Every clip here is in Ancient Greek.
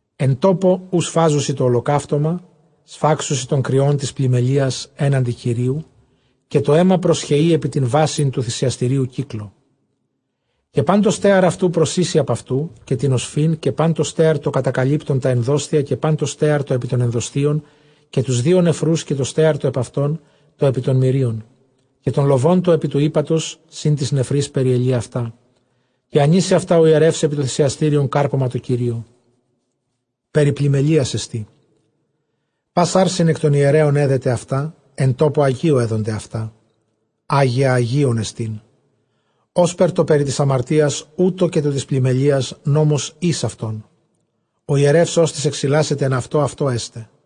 Ἐν τόπῳ οὗ σφάζουσι τὸ ὁλοκαύτωμα, σφάξουσι τὸν κριὸν τῆς πλημμελείας ἔναντι Κυρίου· καὶ τὸ αἷμα προσχεεῖ ἐπὶ τὴν βάσιν τοῦ θυσιαστηρίου κύκλῳ· Καὶ πᾶν τὸ στέαρ αὐτοῦ προσοίσει ἀπʼ αὐτοῦ, καὶ τὴν ὀσφὺν, καὶ πᾶν τὸ στέαρ τὸ κατακαλύπτον τὰ ἐνδόσθια, καὶ πᾶν τὸ στέαρ τὸ ἐπὶ τῶν ἐνδοσθίων, καὶ τοὺς δύο νεφροὺς, καὶ τὸ στέαρ τὸ ἐπʼ αὐτῶν, τὸ ἐπὶ τῶν μηρίων, καὶ τὸν λοβὸν τὸν ἐπὶ τοῦ ἥπατος σὺν τοῖς νεφροῖς, περιελεῖ αὐτά. Καὶ ἀνοίσει αὐτὰ ὁ ἱερεὺς ἐπὶ τὸ θυσιαστήριον κάρπωμα τῷ Κυρίῳ· περὶ πλημμελείας ἐστί. Πᾶς ἄρσην ἐκ τῶν ἱερέων ἔδεται αὐτά· ἐν τόπῳ ἁγίῳ ἔδονται αὐτά ἅγια ἁγίων ἐστίν. Ὥσπερ τὸ περὶ τῆς ἁμαρτίας, οὕτω καὶ τὸ τῆς πλημμελείας· νόμος εἷς αὐτῶν· ὁ ἱερεὺς ὅστις ἐξιλάσεται ἐν αὐτῷ, αὐτῷ ἔσται.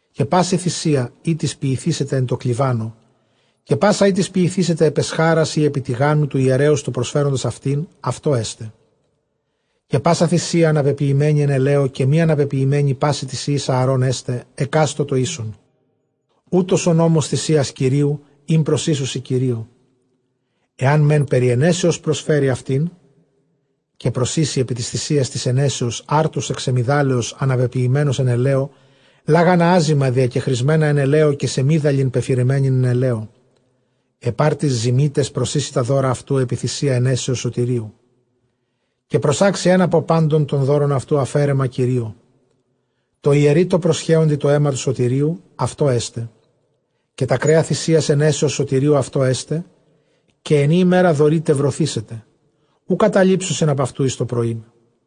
Καὶ πᾶσα θυσία ἥτις ποιηθήσεται ἐν τῷ κλιβάνῳ, καὶ πᾶσα ἥτις ποιηθήσεται ἐπʼ ἐσχάρας, ἢ ἐπὶ τηγάνου, τοῦ ἱερέως τοῦ προσφέροντος αὐτὴν, αὐτῷ ἔσται. Καὶ πᾶσα θυσία ἀναπεποιημένη ἐν ἐλαίῳ, καὶ μὴ ἀναπεποιημένη, πᾶσι τοῖς υἱοῖς Ἀαρὼν ἔσται, ἑκάστῳ τὸ ἶσον. Οὗτος ὁ νόμος θυσίας σωτηρίου, ἣν προσοίσουσι Κυρίῳ. Ἐὰν μὲν περὶ αἰνέσεως προσφέρῃ αὐτήν, καὶ προσοίσει ἐπὶ τῆς θυσίας τῆς αἰνέσεως ἄρτους ἐκ σεμιδάλεως ἀναπεποιημένους ἐν ἐλαίῳ, καὶ λάγανα ἄζυμα διακεχρισμένα ἐν ἐλαίῳ, καὶ σεμίδαλιν πεφυραμένην ἐν ἐλαίῳ. Ἐπʼ ἄρτοις ζυμίταις προσοίσει τὰ δῶρα αὐτοῦ ἐπὶ θυσίᾳ αἰνέσεως σωτηρίου. Καὶ προσάξει ἓν ἀπὸ πάντων τῶν δώρων αὐτοῦ, ἀφαίρεμα Κυρίῳ· τῷ ἱερεῖ τῷ προσχέοντι τὸ αἷμα τοῦ σωτηρίου, αὐτῷ ἔσται. Καὶ τὰ κρέα θυαίας αἰνέσεως σωτηρίου αὐτῷ ἔσται· καὶ ἐν ᾗ ἡμέρᾳ δωρεῖται, βρωθήσεται· οὐ καταλείψουσιν ἀπʼ αὐτοῦ εἰς τὸ πρωΐ.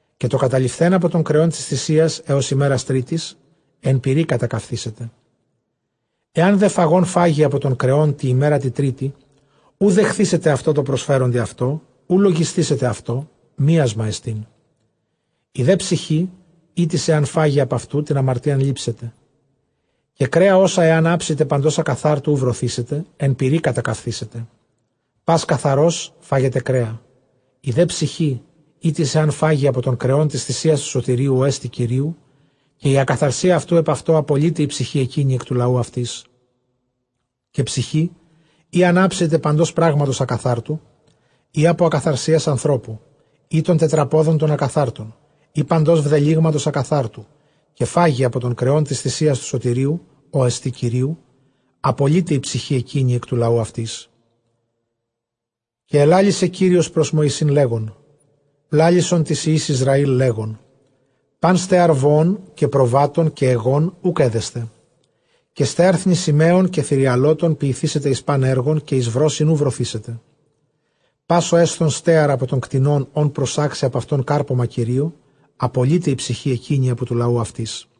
Καὶ τὸ καταλειφθὲν ἀπὸ τῶν κρεῶν τῆς θυσίας ἕως ἡμέρας τρίτης, ἐν πυρὶ κατακαυθήσεται. Ἐὰν δὲ φαγὼν φάγῃ ἀπὸ τῶν κρεῶν τῇ ἡμέρᾳ τῇ τρίτῃ, οὐ δεχθήσεται αὐτῷ τῷ προσφέροντι αὐτό· οὐ λογισθήσεται αὐτῷ, μίασμά ἐστιν· ἡ δὲ ψυχὴ ἥτις ἐὰν φάγῃ ἀπʼ αὐτοῦ, τὴν ἁμαρτίαν λήψεται. Καὶ κρέα ὅσα ἐὰν ἅψηται παντὸς ἀκαθάρτου, οὐ βρωθήσεται, ἐν πυρὶ κατακαυθήσεται· πᾶς καθαρὸς φάγεται κρέα. Ἡ δὲ ψυχὴ ἥτις ἐὰν φάγῃ ἀπὸ τῶν κρεῶν τῆς θυσίας τοῦ σωτηρίου, ὅ ἐστι Κυρίου, καὶ ἡ ἀκαθαρσία αὐτοῦ ἐπʼ αὐτῷ, ἀπολεῖται ἡ ψυχὴ ἐκείνη ἐκ τοῦ λαοῦ αὐτῆς. Καὶ ἡ ψυχὴ ἣ ἂν ἅψηται παντὸς πράγματος ἀκαθάρτου, ἢ ἀπὸ ἀκαθαρσίας ἀνθρώπου, ἢ τῶν τετραπόδων τῶν ἀκαθάρτω ἢ παντὸς βδελύγματος ἀκαθάρτου, καὶ φάγῃ ἀπὸ τῶν κρεῶν τῆς θυσίας τοῦ σωτηρίου, ὅ ἐστι Κυρίου, ἀπολεῖται ἡ ψυχὴ ἐκείνη ἐκ τοῦ λαοῦ αὐτῆς. Καὶ ἐλάλησε Κύριος πρὸς Μωυσῆν, λέγων, λάλησον τοῖς υἱοῖς Ἰσραὴλ, λέγων, πᾶν στέαρ βοῶν, καὶ προβάτων, καὶ αἰγῶν οὐκ ἔδεσθε. Καὶ στέαρ θνησιμαίων καὶ θηριαλώτων ποιηθήσεται εἰς πᾶν ἔργον, καὶ εἰς βρῶσιν οὐ βρωθήσεται. Πᾶς ὁ ἔσθων στέαρ ἀπὸ τῶν κτηνῶν, ὧν προσάξει ἀπʼ αὐτῶν κάρπωμα Κυρίῳ, ἀπολεῖται ἡ ψυχὴ ἐκείνη ἀπὸ τοῦ λαοῦ αὐτῆς.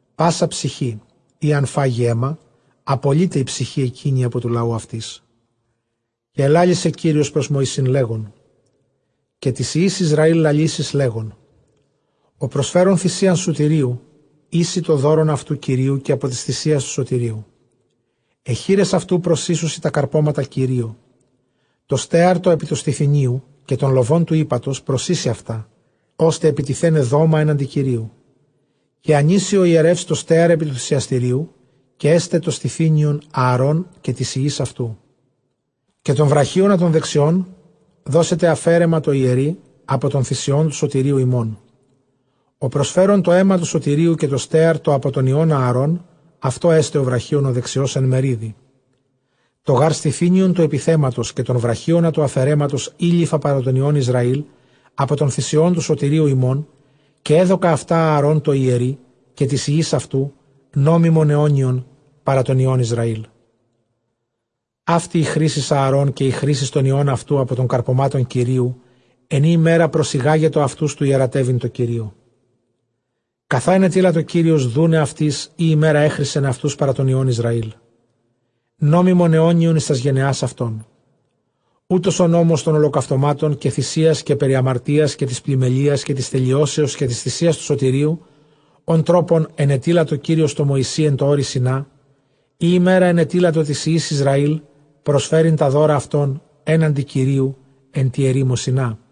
Πᾶσα ψυχὴ ἣ ἂν φάγῃ αἷμα, ἀπολεῖται ἡ ψυχὴ ἐκείνη ἀπὸ τοῦ λαοῦ αὐτῆς. Καὶ ἐλάλησε Κύριος πρὸς Μωυσῆν, λέγων, καὶ τοῖς υἱοῖς Ἰσραὴλ λαλήσεις, λέγων, ὁ προσφέρων θυσίαν σωτηρίου, οἴσει τὸ δῶρον αὐτοῦ Κυρίῳ καὶ ἀπὸ τῆς θυσίας τοῦ σωτηρίου. Αἱ χεῖρες αὐτοῦ προσοίσουσι τὰ καρπώματα Κυρίῳ· τὸ στέαρ τὸ ἐπὶ τοῦ στηθυνίου, καὶ τὸν λοβὸν τοῦ ἥπατος προσοίσει αὐτὰ, ὥστε ἐπιτιθέναι δόμα ἔναντι Κυρίου. Καὶ ἀνοίσει ὁ ἱερεὺς τὸ στέαρ ἐπὶ τοῦ θυσιαστηρίου· καὶ ἔσται τὸ στηθύνιον Ἀαρὼν καὶ τοῖς υἱοῖς αὐτοῦ. Καὶ τὸν βραχίονα τὸν δεξιὸν δώσετε ἀφαίρεμα τῷ ἱερεῖ ἀπὸ τῶν θυσιῶν τοῦ σωτηρίου ὑμῶν. Ὁ προσφέρων τὸ αἷμα τοῦ σωτηρίου, καὶ τὸ στέαρ τὸ ἀπὸ τῶν υἱῶν Ἀαρὼν, αὐτῷ ἔσται ὁ βραχίων ὁ δεξιὸς ἐν μερίδι. Τὸ γὰρ στηθύνιον τοῦ ἐπιθέματος καὶ τὸν βραχίονα τοῦ ἀφαιρέματος εἴληφα παρὰ τῶν υἱῶν Ἰσραὴλ ἀπὸ τῶν θυσιῶν τοῦ σωτηρίου ὑμῶν, καὶ ἔδωκα αὐτὰ Ἀαρὼν τῷ ἱερεῖ καὶ τοῖς υἱοῖς αὐτοῦ, νόμιμον αἰώνιον παρὰ τῶν υἱῶν Ἰσραήλ. Αὕτη ἡ χρίσις Ἀαρὼν, καὶ ἡ χρίσις τῶν υἱῶν αὐτοῦ ἀπὸ τῶν καρπωμάτων Κυρίου, ἐν ᾗ ἡμέρᾳ προσηγάγετο αὐτοὺς τοῦ ἱερατεύειν τῷ Κυρίῳ, καθὰ ἐνετείλατο Κύριος δοῦναι αὐτοῖς ᾗ ἡμέρᾳ ἔχρισεν αὐτοὺς παρὰ τῶν υἱῶν Ἰσραὴλ, νόμιμον αἰώνιον εἰς τὰς γενεὰς αὐτῶν. Οὗτος ὁ νόμος τῶν ὁλοκαυτωμάτων, καὶ θυσίας, καὶ περὶ ἁμαρτίας, καὶ τῆς πλημμελείας καὶ τῆς τελειώσεως, καὶ τῆς θυσίας τοῦ σωτηρίου, ὃν τρόπον ἐνετείλατο Κύριος τῷ Μωυσῇ ἐν τῷ ὄρει Σινᾷ, ᾗ ἡμέρᾳ ἐνετείλατο τοῖς υἱοῖς Ἰσραὴλ προσφέρειν τὰ δῶρα αὐτῶν ἔναντι Κυρίου ἐν τῇ ἐρήμῳ Σινᾷ.